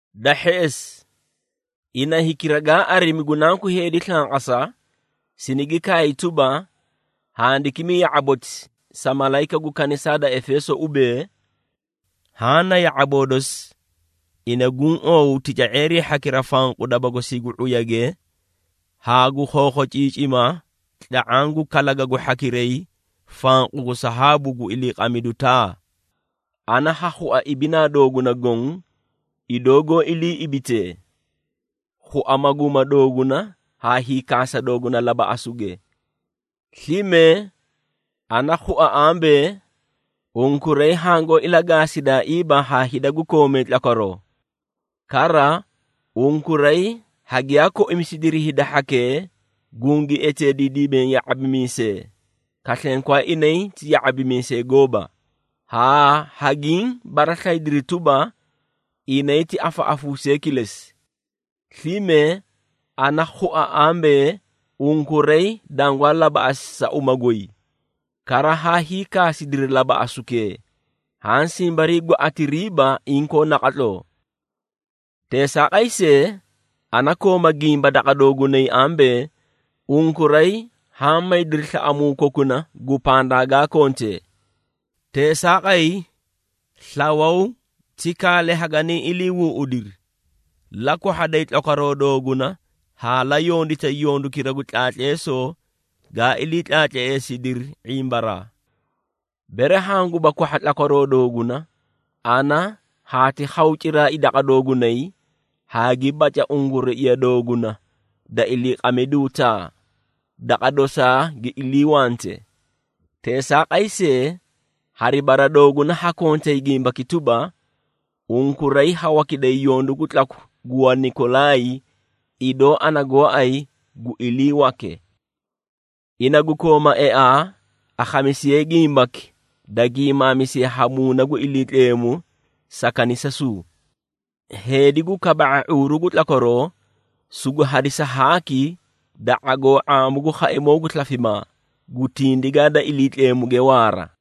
Da hheꞌesi, ina hikira gaa arimi gu Nanku Heedi slanqasa, sinigi kaay tuba, handikimi ya⁄aboti sa malayika gu kanisaa da Efeeso ubee, Haã na ya⁄aboo dosi, ina guũ oow tica⁄eerii hhakira fanqu daba gosii gu ⁄uyage, haa gu khokhociicima tla⁄aã gu kalagagu hhakiray fanqu gu sahaabu gu iliiqamidu taa. Ana ha khua ibinaa dooguna goõ idoo goó ilii ibitee, khua maguuma dooguna haa hiikaasa dooguna labaꞌasuge. Slime, ana khua ambee, unkuray hangoó ilagaasidaaiiba haa hida gu koomee tlakwaroo. Kara, unkuray hagiyaa koimisidiri hida hhakee gungi eteediidimee ya⁄abimiisee, kaslenkwaa inay ti ya⁄abimiisee gooba, haa hagiĩ baraslayidiri tuba, inay ti afaꞌafuusee kilesi. Slime, ana khua ambee, unkuray dangwaa labaꞌasi sa uma goy, kara haa hiikaasidiri labaꞌasukee, haã simbarii gwaꞌatiriiba inkoo naqatloo. Teesaaqay see, ana kooma gimba daqa doogunay ambee, unkuray haã maydiri slaꞌamuu kokuna gu pandaa gaa kontee. Teesaaqay, slawaw ti kaale haganiĩ iliihuuꞌudiri, la kwahhaday tlakwaroo dooguna haa la yonditay yondukira gu tlaatleesoo gaa ilii tlaatleesidiri ⁄imbaraa. Bere hanguba kwahha tlakwaroo dooguna, ana haati khaw ciraai daqa doogunay haa gi baca unguruiya dooguna da iliiqamiduu taa, daqa dosaa gi iliiwante. Teesaaqay see, hari bara dooguna ha kontay gimbaki tuba, unkuray ha wakiday yondu gu tlaku gu Wanikolaay, idoo ana gooay gu iliiwake. Ina gu kooma eaa, akhamisiye gimbaki da gimaamisiye ha Muuna gu Iliitleemu sa kanisasuu. Heedi gu kaba⁄a ⁄uuru gu tlakwaroo, sugu hadisa haaki da ⁄agoo ⁄aamu gu khaimoo gu slafimaa, gu tindigaa da Iliitleemuge waara.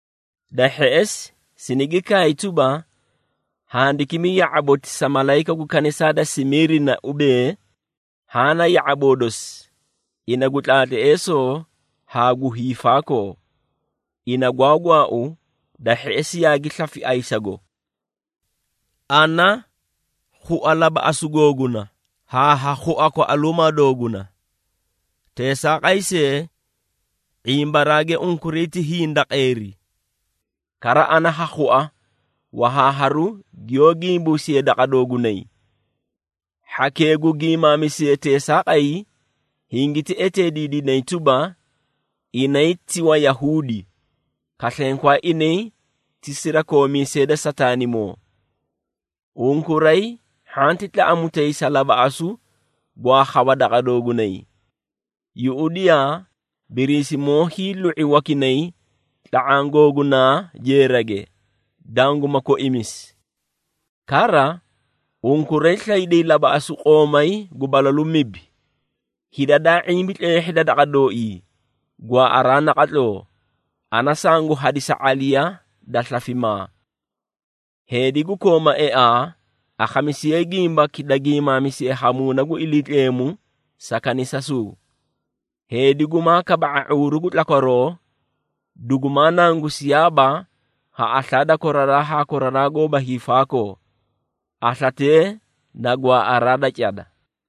Da hheꞌesi, sinigi kaay tuba, handikimi ya⁄aboti sa malayika gu kanisaa da Simiirina ubee, Haã na ya⁄aboo dosi, ina gu tlaatleesoo haa gu hiifaakoo, ina gwaa gwaau da hheꞌesi yaagi slafi ayisago. Ana khua labaꞌasu googuna haa ha khua kwaꞌaluumaa dooguna. Teesaaqay see, ⁄imbaraage unkuray ti hindaqeeri! Kara ana ha khua wahaaharu giyoó gimbumisiyee daqa doogunay. Hhakee gu giimaamisee teesaaqay hingiti eteediidinay tuba, inay ti Wayahuudi, kaslenkoo inay ti sirakoomiisee da Sataanimoo. Unkuray, hhanti tlaꞌamutay sa labaꞌasu gwaa khawa daqa doogunay. Yuꞌudiyaa! Biriisimoo hiilu⁄i wakinay tla⁄aã googunaa jeerage, danguma koimisi. Kara, unkuray slayday labaꞌasu qoomay gu balalu mibi. Hida daa ⁄imbi tleehhida daqa dooii, gwaaꞌaraa naqatloo, ana sangu hadisa ⁄aliya da slafimaa. Heedi gu kooma eaa akhamisiye, gimbaki da giimaamisiye ha Muuna gu Iliitleemu sa kanisasuu. Heedi gumaa kaba⁄a ⁄uuru gu tlakwaroo, dugumaa nangusiyaaba ha aslaa da koraraa haa koraraa goóba hiifaakoo. Aslatee na gwaaꞌaraa da cada.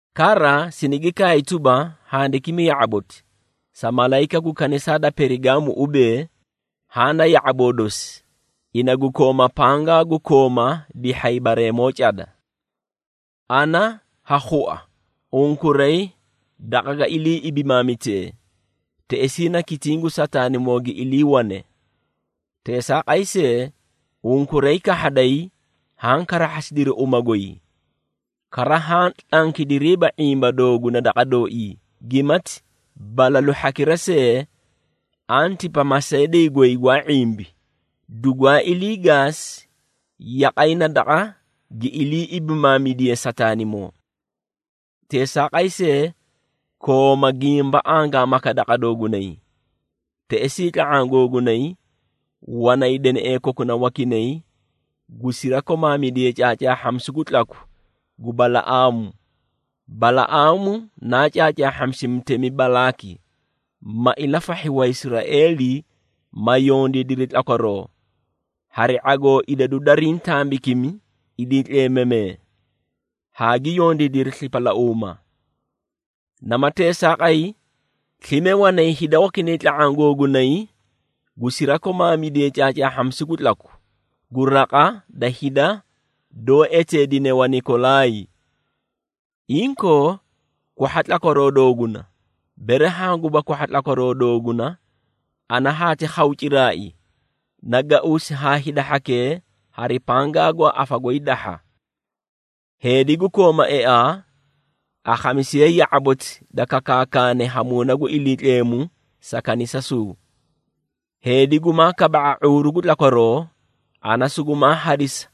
Kara, sinigi kaay tuba, handikimi ya⁄aboti, sa malayika gu kanisaa da Perigaamu ubee, Haã na ya⁄aboo dosi ina gu kooma pangaa gu kooma dihhay bareemoo cada. Ana ha khua unkuray daqa ga ilii ibimaamitee, teꞌesii na kitiĩ gu Sataanimoo gi iliiwane. Teesaaqay see, unkuray kahhaday haã karahhasidiri uma goy. Kara, haã tlankidiiba ⁄imba doogu daqa dooii, gimati balalu hhakira see, Antipa, masaydii goy gwaa ⁄imbi dugwaa ilii gaasi, yaqay na daqa gi ilii ibimaamidiye Sataanimoo. Teesaaqay see, kooma gimba angaamaka daqa doogunay. Teꞌesii tla⁄aã googunay, wanay deneꞌee kokuna wakinay gu sirakomaamidee caacaahhamisu gu tlaku gu Balaꞌaamu. Balaꞌaamu naa caacaahhamisi mutemi Balaaki, ma ilafahhi Waisraeeli, ma yondiidiri tlakwaroo, hari ⁄agoo idadu dariĩ tambakimi iliitleemamee, haa gi yondiidiri slipalauuma. Nama teesaaqay, slime wanay hida wakinay tla⁄aã googunay gu sirakomaamidee caacaahhamisu gu tlaku, gu raqa da hida doó eteedine Wanikolaay. Inkoo, kwahha tlakwaroo dooguna! Bere hanguba kwahha tlakwaroo dooguna, ana haati khaw ciraai, nagauusi haa hida hhakee, hari pangaa gwaa afa goy dahha. Heedi gu koomee eaa akhamisiye ya⁄aboti da kakaakane ha Muuna gu Iliitleemu sa kanisasuu. Heedi gumaa kaba⁄a ⁄uuru gu tlakwaroo, ana sugumaa hadisa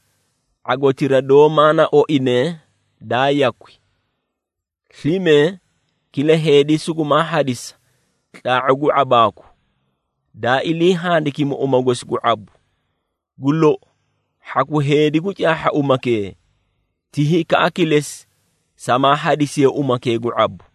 ⁄agotira doó maana oine daa yakwi. Slime kila heedi sugumaa hadisa tlaa⁄u gu ⁄abaaku, daa ilii handikimi uma gosi gu ⁄abu. Gu lou, hhaku heedi gu caahha umakee, ti hikaꞌa kilesi samaa hadisiye umakee gu ⁄abu.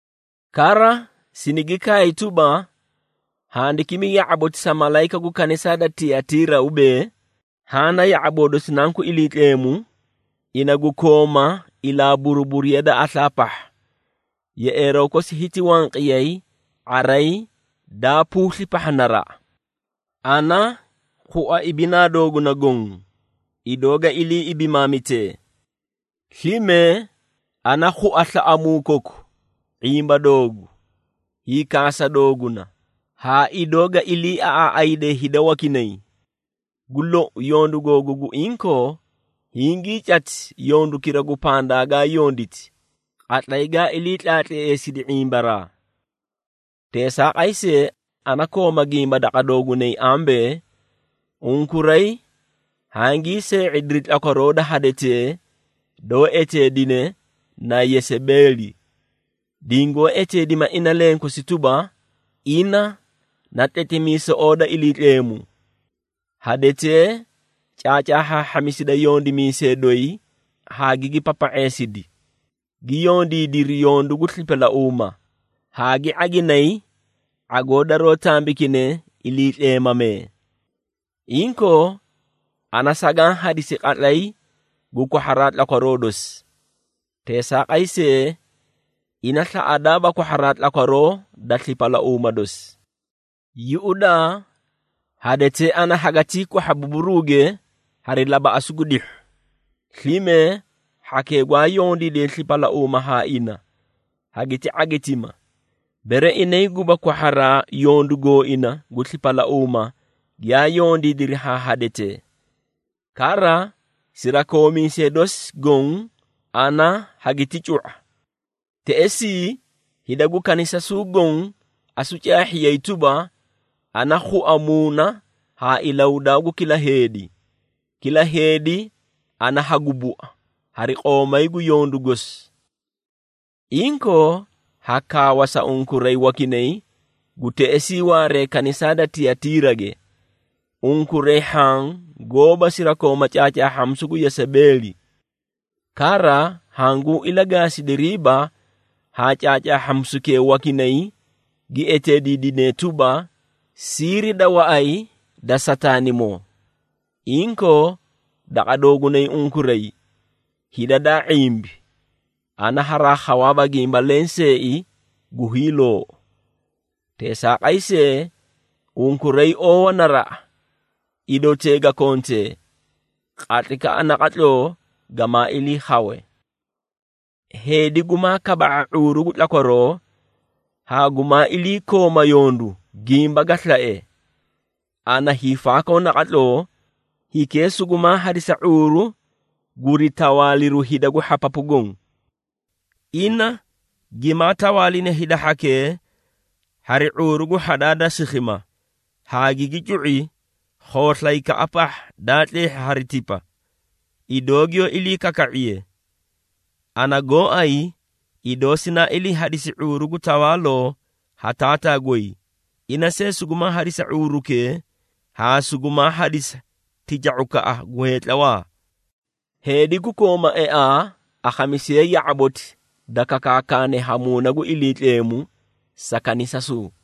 Kara sinigi kaay tuba, handikimi ya⁄aboti sa malayika gu kanisaa da Tiyatiira ubee, “Haã na ya⁄aboo dosi Nanku Iliitleemu, ina gu kooma ilaa buruburiya da aslaa pahha. Yeꞌeeroo kosi hiti wanqiyay ⁄aray daa puusli pahha naraꞌa. Ana khua ibinaa dooguna goõ, idoo ga ilii ibimaamitee. Slime ana khua slaꞌamuu koku, ⁄imba doogu, hiikaasa dooguna haa idoo ga iliiaꞌaaꞌayde hida wakinay. Gu lou, yondu googu gu inkoo, hingii cati yondukira gu pandaa gaa yonditi, qatlay gaa ilii tlaatleesidi ⁄imbaraa. Teesaaqay see, ana kooma gimba daqa doogunay ambee, unkuray hangii see⁄ediri tlakwaroo da hadetee doó eteedine na Yesebeeli, dingoó eteedima ina lenkosi tuba, ina na tletimiisoꞌoo da Iliitleemu. Hadetee caacaahhaahhamisida yondimiisee doyi haa gigi papa⁄eedeesidi, gi yondiidiri yondu gu slipalauuma, haa gi ⁄aginay ⁄agoo daroó tambikine iliitleemamee. Inkoo, ana sagaã hadisi qatlay gu kwahharaa tlakwaroo dosi. Teesaaqay see, ina slaꞌadaaba kwahharaa tlakwaroo da slipalauuma dosi. Yuꞌudaa, hadetee ana hagatii kwahha buburuuge hari labaꞌasu gu dihhu. Slime hhakee gwaa yondiidee slipalauuma haa ina, hagiti ⁄agitima, bere inay guba kwahharaa yondu gooina gu slipalauuma giyaa yondiidiri haa hadetee. Kara, sirakoomiisee dosi goõ ana hagiti cu⁄a. Teꞌesii, hida gu kanisasuu goõ asu caahhiyay tuba, ana khua muuna haa ilahudaa gu kila heedi. Kila heedi ana hagu bua, hari qoomay gu yondu gosi. Inkoo, ha kaawa sa unkuray wakinay gu teꞌesii waaree kanisaa da Tiyatiirage, unkuray hhaã goóba sirakooma caacaahhamisu gu Yesebeeli. Kara hanguu ilagaasidiriiba haa caacaahhamisukee wakinay gi eteediidinee tuba, ‘Siiri da waꞌay da Sataanimoo.’ Inkoo, daqa doogunay unkuray hida daa ⁄imbi ana haraa khawaaba gimba lenseei gu hiiloou. Teesaaqay see, unkuray oowa naraꞌa idotee ga kontee, qatlaykaꞌa naqatloo gamaa ilii khawe. Heedi gumaa kaba⁄a ⁄uuru gu tlakwaroo, haa gumaa iliikooma yondu gimba ga slae ana hiifaakoo naqatloo, hikee sugumaa hadisa ⁄uuru guri tawaaliru hida gu hhapapu goõ. Ina gimaa tawaalina hida hhakee hari ⁄uuru gu hhadaa da sikhima haa gigi cu⁄i khooslayka pahha daa tleehhi hari tipa, idoo giyoó ilii kaka⁄iye. Ana gooay idoo sinaa ilii hadisi ⁄uuru gu tawaaloo ha Taataa goy, ina see sugu hadisa ⁄uurukee haa sugumaa hadisa tica⁄ukaꞌa gu heetlawaa. Heedi gu kooma eaa, akhamisiye ya⁄aboti da kakaakane ha Muuna gu Iliitleemu sa kanisasuu.”